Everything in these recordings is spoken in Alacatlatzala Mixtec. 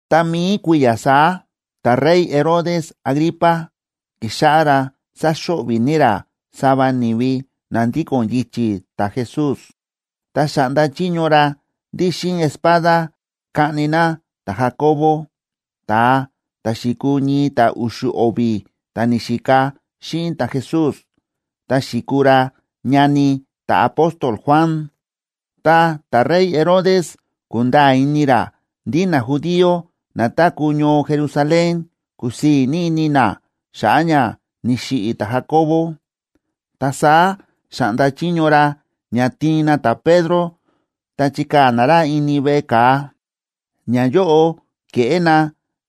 Ta mi̱i kui̱ya̱ saá ta̱rey Herodes Agripa ki̱xáꞌá ra sáxo̱ꞌvi̱ ní ra sava ni̱vi na ndíko̱n yichi̱ ta̱Jesús. Ta xa̱ꞌnda chiño ra ndí xíꞌin espada kaꞌni na ta̱Jacobo, ta̱a ta̱ xi̱kuu ñii ta̱ u̱xu̱ o̱vi̱ ta̱ ni̱xika xíꞌin ta̱Jesús, ta xi̱kuu ra ñani ta̱apóstol Juan. Tá ta̱rey Herodes ku̱nda̱a̱ ini ra ndí najudío na táku̱ ñoo Jerusalén kúsii̱ ní ini na xa̱ꞌa̱ ña ni̱xiꞌi̱ ta̱Jacobo, ta saá xa̱ꞌnda chiño ra ña tiin na ta̱Pedro ta chikaa̱ na ra ini veꞌe ka̱a. Ñayóꞌo ke̱ꞌé na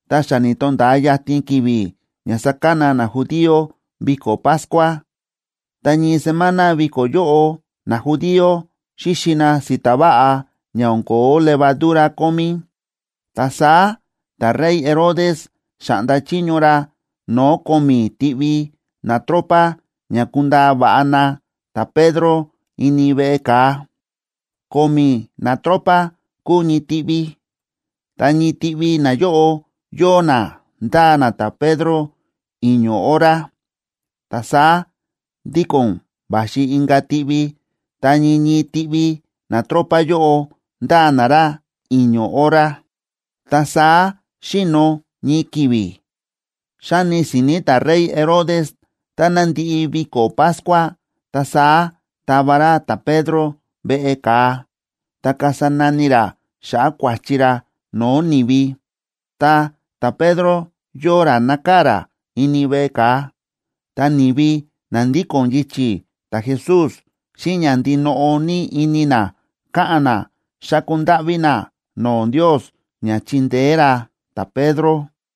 tá xa ni̱to̱nda̱a yatin ki̱vi̱ ña sákana najudío viko̱ Pascua,a ta ñii semana viko̱ yóꞌo najudío xíxi na si̱ta̱ váꞌa ña o̱n ko̱ó levadura kómí. Ta saá ta̱rey Herodes xa̱ꞌnda chiño ra no̱o̱ ko̱mi̱ tiꞌvi natropa ña kundaa va̱ꞌa na ta̱Pedro ini veꞌe ka̱a. Ko̱mi̱ natropa kúu ñii tiꞌvi, ta ñii tiꞌvi nayóꞌo yóo na ndáa na ta̱Pedro i̱ño̱ hora, ta saá ndíko̱n va̱xi inka̱ tiꞌvi, ta ñii ñii tiꞌvi natropa yóꞌo ndáa na ra i̱ño̱ hora, ta saá xi̱no̱ ñii ki̱vi̱. Xa̱ni si̱ni̱ ta̱rey Herodes táná ndi̱ꞌi viko̱ Pascua, ta saá tava ra ta̱Pedro veꞌe ka̱a, ta kasa nani ra xa̱ꞌa̱ kua̱chi ra no̱o̱ ni̱vi. Ta ta̱Pedro yóo ra nákaa̱ ra ini veꞌe ka̱a, ta ni̱vi na ndíko̱n yichi̱ ta̱Jesús xíꞌin ña ndinoꞌo ní ini na káꞌa̱n na, xáku ndáꞌví na no̱o̱ Ndios ña chindeé ra ta̱Pedro.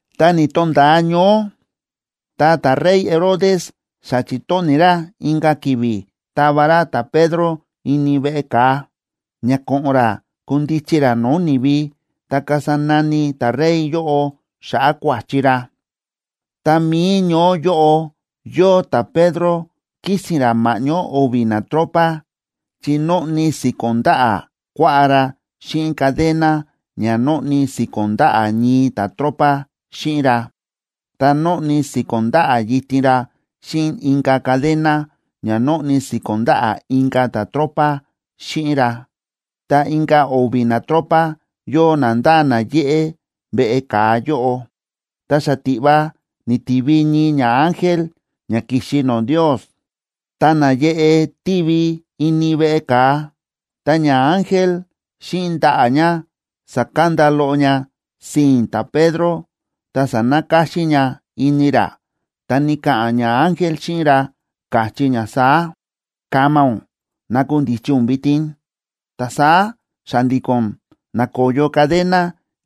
Ta ni̱to̱nda̱a ñoó, ta ta̱rey Herodes xa chi̱tóni̱ ra inka̱ ki̱vi̱ tava ra ta̱Pedro ini veꞌe ka̱a, ña ko̱ꞌo̱n ra kundichi ra no̱o̱ ni̱vi, ta kasa nani ta̱rey yóꞌo xa̱ꞌa̱ kua̱chi ra. Ta mi̱i ñoó yóꞌo yóo ta̱Pedro kísi̱n ra ma̱ꞌñó o̱vi̱ natropa, chi nóꞌni si̱ko̱n ndaꞌa̱ kuaꞌá ra xíꞌin cadena ña nóꞌni si̱ko̱n ndaꞌa̱ ñii ta̱tropa xíꞌin ra, ta nóꞌni si̱ko̱n ndaꞌa̱ yitin ra xíꞌin inka̱ cadena ña nóꞌni si̱ko̱n ndaꞌa̱ inka̱ ta̱tropa xíꞌin ra, ta inka̱ o̱vi̱ natropa yóo na ndáa na yéꞌé veꞌe ka̱a yóꞌo. Ta xatiꞌva ni̱tivi ñii ñaángel ña ki̱xi no̱o̱ Ndios, ta náyeꞌe tívi ini veꞌe ka̱a. Ta ñaángel xíꞌin ndaꞌa̱ ña sa̱kanda loꞌo ña sii̱n ta̱Pedro, ta sa̱nakáxín ña ini ra. Ta ni̱ka̱ꞌa̱n ñaángel xíꞌin ra, káchí ña saá: ―¡Kama ún! ¡Nakundichi ún vitin! Ta saá xa̱ndi̱ko̱n na̱koyo cadena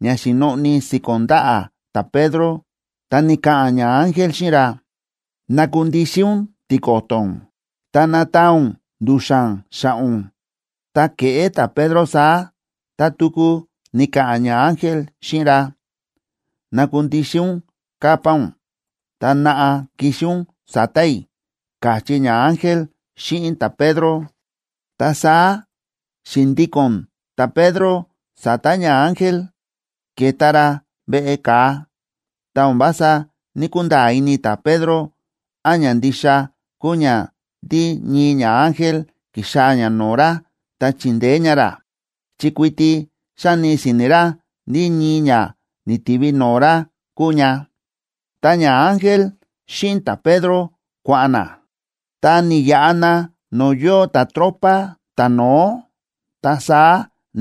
ña xi̱noꞌni si̱ko̱n ndaꞌa̱ ta̱Pedro. Ta ni̱ka̱ꞌa̱n ñaángel xíꞌin ra: ―Nakundixin ún tiko̱to̱ ún, ta nataan ún ndu̱xa̱n xa̱ꞌa̱ ún. Tá ke̱ꞌé ta̱Pedro saá, ta tuku ni̱ka̱ꞌa̱n ñaángel xíꞌin ra: ―Nakundixin ún capa ún, ta naꞌa, kixi ún sa̱ta̱ i̱ ―káchí ñaángel xíꞌin ta̱Pedro. Ta saá xi̱ndíko̱n ta̱Pedro sa̱ta̱ ñaángel, ke̱ta ra veꞌe ka̱a. Ta o̱n vása ní‑kunda̱a̱ ini ta̱Pedro án ña ndixa kúu ña ndí ñii ñaángel ki̱xaa̱ ña no̱o̱ ra ta chíndeé ña ra, chi kuiti xáni si̱ni̱ ra ndí ñii ña ni̱tivi no̱o̱ ra kúu ña. Ta ñaángel xíꞌin ta̱Pedro kua̱ꞌa̱n na, ta ni̱yaꞌa na no̱o̱ yóo ta̱tropa ta̱no̱ó, ta saá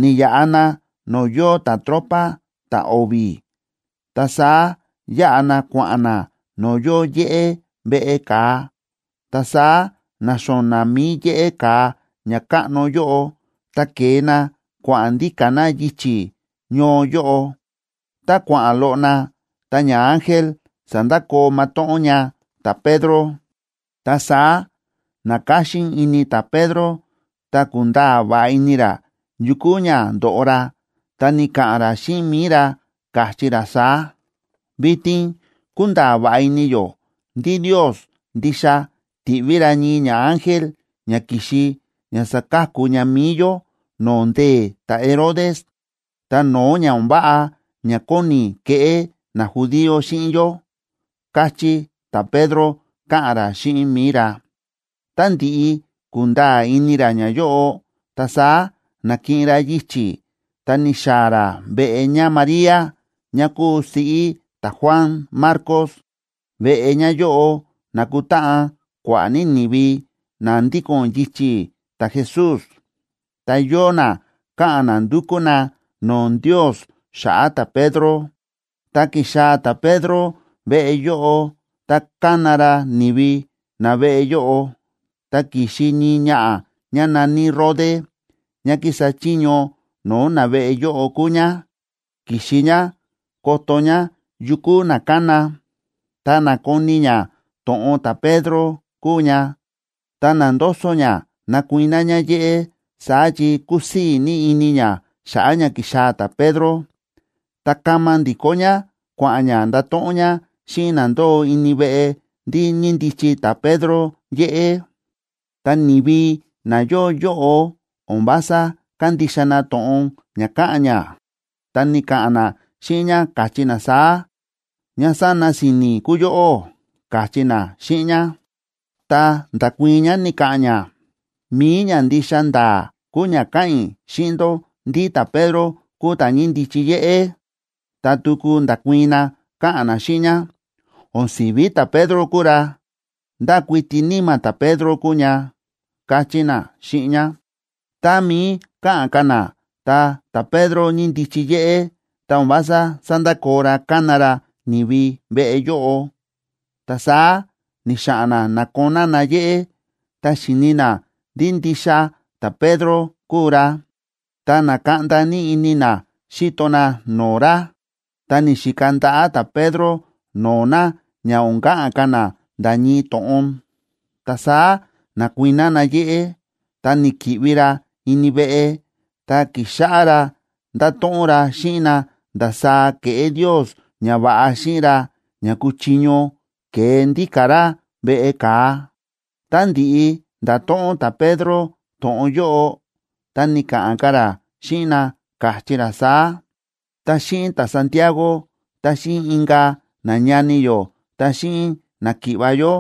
ni̱yaꞌa na no̱o̱ yóo ta̱tropa ta̱o̱vi̱, ta saá yáꞌa na kua̱ꞌa̱n na no̱o̱ yóo yéꞌé veꞌe ka̱a, ta saá na̱xo̱na̱ mi̱i yéꞌé ka̱a ña káꞌno yóꞌo, ta ke̱e na kua̱ꞌa̱n ndíka̱ na yichi̱ ñoo yóꞌo. Tá kua̱ꞌa̱n loꞌo na, ta ñaángel sa̱ndakoo matóꞌón ña ta̱Pedro. Ta saá na̱káxín ini ta̱Pedro, ta ku̱nda̱a̱ va̱ꞌa ini ra yu kúu ña ndo̱ꞌo ra. Ta ni̱ka̱ꞌa̱n ra xíꞌin mi̱i ra, káchí ra saá: ―Vitin kúnda̱a̱ va̱ꞌa ini yó ndí Ndios ndixa ti̱ꞌví ra ñii ñaángel ña ki̱xi ña sa̱ka̱ku ña mi̱i yó no̱o̱ ndee̱ ta̱Herodes, ta no̱o̱ ña o̱n váꞌa ña kóni keꞌé najudío xíꞌin yó ―káchí ta̱Pedro, káꞌa̱n ra xíꞌin mi̱i ra. Tá ndi̱ꞌi ku̱nda̱a̱ ini ra ñayóꞌo, ta saá na̱kiꞌin ra yichi̱ ta ni̱xaa̱ ra veꞌe ñáMaría, ñá kúu siꞌí ta̱Juan Marcos. Veꞌe ñáyóꞌo na̱kutáꞌan kua̱ꞌa̱ ní ni̱vi na ndíko̱n yichi̱ ta̱Jesús, ta yóo na káꞌa̱n na ndúkú na no̱o̱ Ndios xa̱ꞌa̱ ta̱Pedro. Ta ki̱xaa̱ ta̱Pedro veꞌe yóꞌo, ta ka̱na ra ni̱vi na veꞌe yóꞌo, ta ki̱xi ñii ñaꞌa̱ ñá na̱ní Rode, ñá kísa chiño no̱o̱ naveꞌe yóꞌo kúu ñá. Ki̱xi ñá koto ñá yu kúu na kána. Ta na̱koni ñá to̱ꞌon ta̱Pedro kúu ña, ta na̱ndoso ñá nakuiná ñá yéꞌé, saá chi kúsii̱ ní ini ñá xa̱ꞌa̱ ña ki̱xaa̱ ta̱Pedro. Ta kama ndi̱kó ñá kua̱ꞌa̱n ñá ndato̱ꞌon ñá xíꞌin na ndóo ini veꞌe ndí ñíndichi ta̱Pedro yéꞌé. Ta ni̱vi na yóo yóꞌo o̱n vása kándixa na to̱ꞌon ña káꞌa̱n ñá, ta ni̱ka̱ꞌa̱n na xíꞌin ñá, káchí na saá: ―Ñá sána si̱ni̱ kúu yóꞌó ―káchí na xíꞌin ñá. Ta nda̱kuii̱n ñá, ni̱ka̱ꞌa̱n ñá: ―Mi̱i ña ndixa nda̱a̱ kúu ña káꞌa̱n i̱ xíꞌin ndó ndí ta̱Pedro kúu ta̱ ñíndichi yéꞌé. Ta tuku nda̱kuii̱n na, káꞌa̱n na xíꞌin ñá: ―O̱n si̱ví ta̱Pedro kúu ra. Ndá kuiti níma̱ ta̱Pedro kúu ña ―káchí na xíꞌin ñá. Tá mií káꞌa̱n ka̱ na, ta ta̱Pedro ñíndichi yéꞌé, ta o̱n vása sándakoo ra kána ra ni̱vi veꞌe yóꞌo. Ta saá ni̱xa̱ꞌa̱n na na̱koná na yéꞌé. Tá xi̱ni na ndí ndixa ta̱Pedro kúu ra, ta na̱kaꞌnda ní ini na xíto na no̱o̱ ra. Ta ni̱xika ndaꞌa̱ ta̱Pedro no̱o̱ na ña o̱n ka̱ꞌa̱n ka̱ na nda̱ ñii to̱ꞌon. Ta saá na̱kuiná na yéꞌé, ta ni̱ki̱ꞌvi ra ini veꞌe, ta ki̱xáꞌá ra ndáto̱ꞌon ra xíꞌin na ndasaá ke̱ꞌé Ndios ñava̱ꞌa xíꞌin ra ña ku̱chiño kee ndíka̱ ra veꞌe ka̱a. Tá ndi̱ꞌi nda̱to̱ꞌon ta̱Pedro to̱ꞌon yóꞌo, ta ni̱ka̱ꞌa̱n ka̱ ra xíꞌin na, káchí ra saá: ―Ta xíꞌin ta̱Santiagob ta xíꞌin inka̱ nañani yó ta xíꞌin náki̱ꞌva̱ yó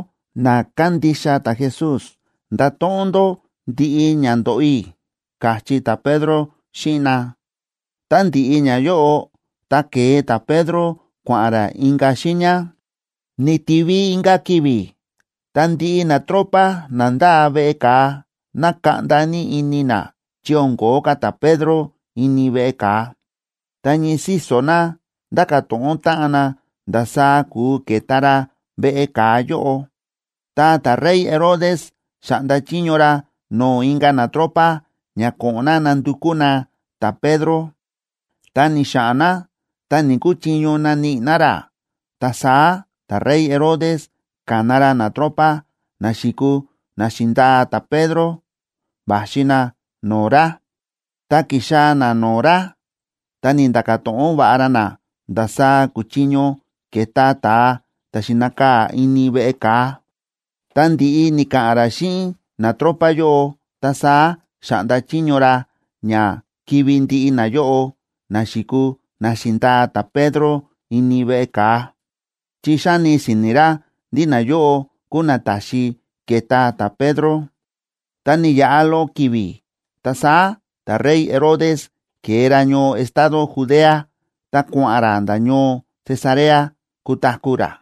na kándixa ta̱Jesús, ndato̱ꞌon ndó ndiꞌi ña ndo̱ꞌo i̱ ―káchí ta̱Pedro xíꞌin na. Tá ndi̱ꞌi ñayóꞌo, ta ke̱e ta̱Pedro, kua̱ꞌa̱n ra inka̱ xiiña. Ni̱tivi inka̱ ki̱vi̱, ta ndiꞌi natropa na ndáa veꞌe ka̱a, na̱kaꞌnda ní ini na chi o̱n ko̱ó ka̱ ta̱Pedro ini veꞌe ka̱a, ta ñii síso̱ na ndáka̱ to̱ꞌon táꞌan na ndasaá kúu ke̱ta ra veꞌe ka̱a yóꞌo. Ta ta̱rey Herodes xa̱ꞌnda chiño ra no̱o̱ inka̱ natropa ña ko̱ꞌo̱n na nandukú na ta̱Pedro. Ta ni̱xa̱ꞌa̱n na, ta ni̱‑kuchiño naníꞌi na ra. Ta saá ta̱rey Herodes ka̱na ra natropa na xi̱kuu na xi̱ndaa ta̱Pedro, va̱xi na no̱o̱ ra. Tá ki̱xaa̱ na no̱o̱ ra, ta ni̱nda̱ka̱ to̱ꞌon va̱ꞌa ra na ndasaá kuchiño ke̱ta ta̱a ta̱ xi̱nakaa̱ ini veꞌe ka̱a. Ta ndi̱ꞌi ni̱ka̱ꞌa̱n ra xíꞌin natropa yóꞌo, ta saá xa̱ꞌnda chiño ra ña kivi̱ ndiꞌi nayóꞌo na xi̱kuu na xi̱ndaa ta̱Pedro ini veꞌe ka̱a, chi xáni si̱ni̱ ra ndí nayóꞌo kúu na ta̱xi ke̱ta ta̱Pedro. Ta ni̱yaꞌa loꞌo ki̱vi̱, ta saá ta̱rey Herodes ke̱e ra ñoo estado Judea ta kua̱ꞌa̱n ra nda̱ ñoo Cesarea kutaku̱ ra.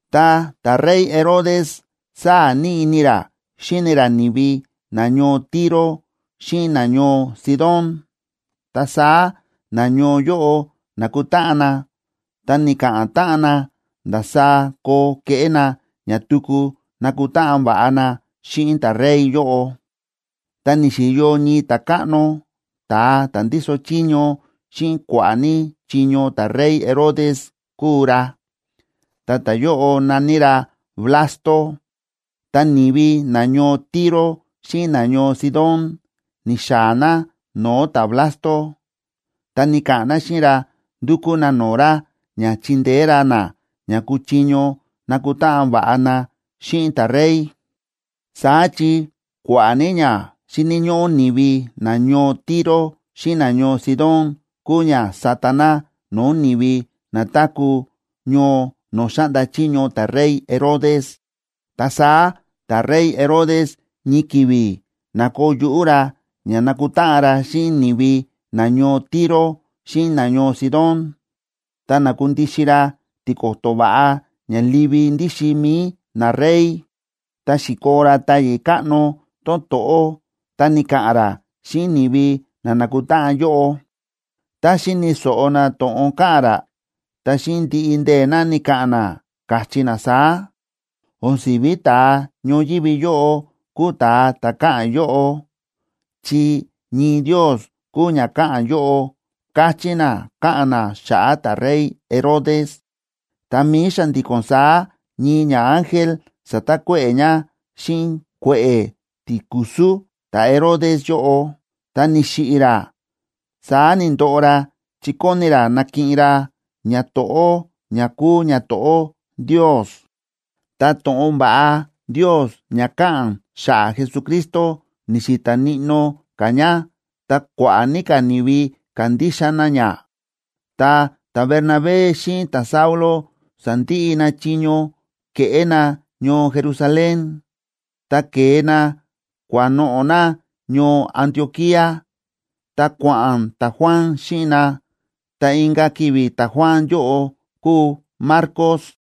Ta ta̱rey Herodes sáa̱ ní ini ra xíni ra ni̱vi nañoo Tiro xíꞌin nañoo Sidón. Ta saá nañoo yóꞌo na̱kutáꞌan na, ta ni̱ka̱ꞌa̱n táꞌan na ndasaá koo keꞌé na ña tuku nakutáꞌan va̱ꞌa na xíꞌin ta̱rey yóꞌo. Ta ni̱xi̱yo ñii ta̱káꞌno, ta̱a ta̱ ndíso chiño xíꞌin kua̱ꞌa̱ ní chiño ta̱rey Herodes kúu ra, ta ta̱yóꞌo na̱ní ra Blasto. Ta ni̱vi nañoo Tiro xíꞌin nañoo Sidón ni̱xaa̱ na no̱o̱ ta̱Blasto, ta ni̱ka̱ꞌa̱n na xíꞌin ra ndúkú na no̱o̱ ra ña chindeé ra na ña kuchiño nakutáꞌan va̱ꞌa na xíꞌin ta̱rey. Saá chi kua̱ꞌa̱ ní ña xíni̱ ñóꞌó ni̱vi nañoo Tiro xíꞌin nañoo Sidón kúu ña sáta na no̱o̱ ni̱vi na táku̱ ñoo no̱o̱ xáꞌnda chiño ta̱rey Herodes. Ta saá ta̱rey Herodes ñii ki̱vi̱ na̱koo yuꞌú ra ña nakutáꞌan ra xíꞌin ni̱vi nañoo Tiro xíꞌin nañoo Sidón, ta na̱kundixin ra tiko̱to̱ va̱ꞌa ña livi ndíxin mi̱i narey, ta xi̱koo ra táyi̱ káꞌno tón to̱ꞌó ta ni̱ka̱ꞌa̱n ra xíꞌin ni̱vi na na̱kutáꞌan yóꞌo. Tá xi̱ni̱ so̱ꞌo na to̱ꞌon káꞌa̱n ra, ta xíꞌin ndiꞌi ndee̱ na ni̱ka̱ꞌa̱n na, káchí na saá: ―O̱n si̱ví ta̱a ñoyívi yóꞌo kúu ta̱a ta̱ káꞌa̱n yóꞌo, chi ñii ndios kúu ña káꞌa̱n yóꞌo ―káchí na, káꞌa̱n na xa̱ꞌa̱ ta̱rey Herodes. Tá mií xa̱ndi̱ko̱n saá ñii ñaángel sa̱takuéꞌe̱ ña xíꞌin kue̱ꞌe̱ tikusú ta̱Herodes yóꞌo, ta ni̱xiꞌi̱ ra. Saá ni̱ndoꞌo ra chi kóni ra nakiꞌin ra ñato̱ꞌó ña kúu ñato̱ꞌó Ndios. Ta to̱ꞌon va̱ꞌa Ndios ña káꞌa̱n xa̱ꞌa̱ Jesucristo ni̱xi̱ta̱ níꞌnó ka̱ ña, ta kua̱ꞌa̱ ní ka̱ ni̱vi ka̱ndixa na ña. Tá ta̱Bernabé xíꞌin ta̱Saulo sa̱ndiꞌi na chiño ke̱ꞌé na ñoo Jerusalén, ta ke̱e na kua̱noꞌo̱ na ñoo Antioquía, ta kua̱ꞌa̱n ta̱Juan xíꞌin na, ta inka̱ ki̱vi̱ ta̱Juan yóꞌo kúu Marcos.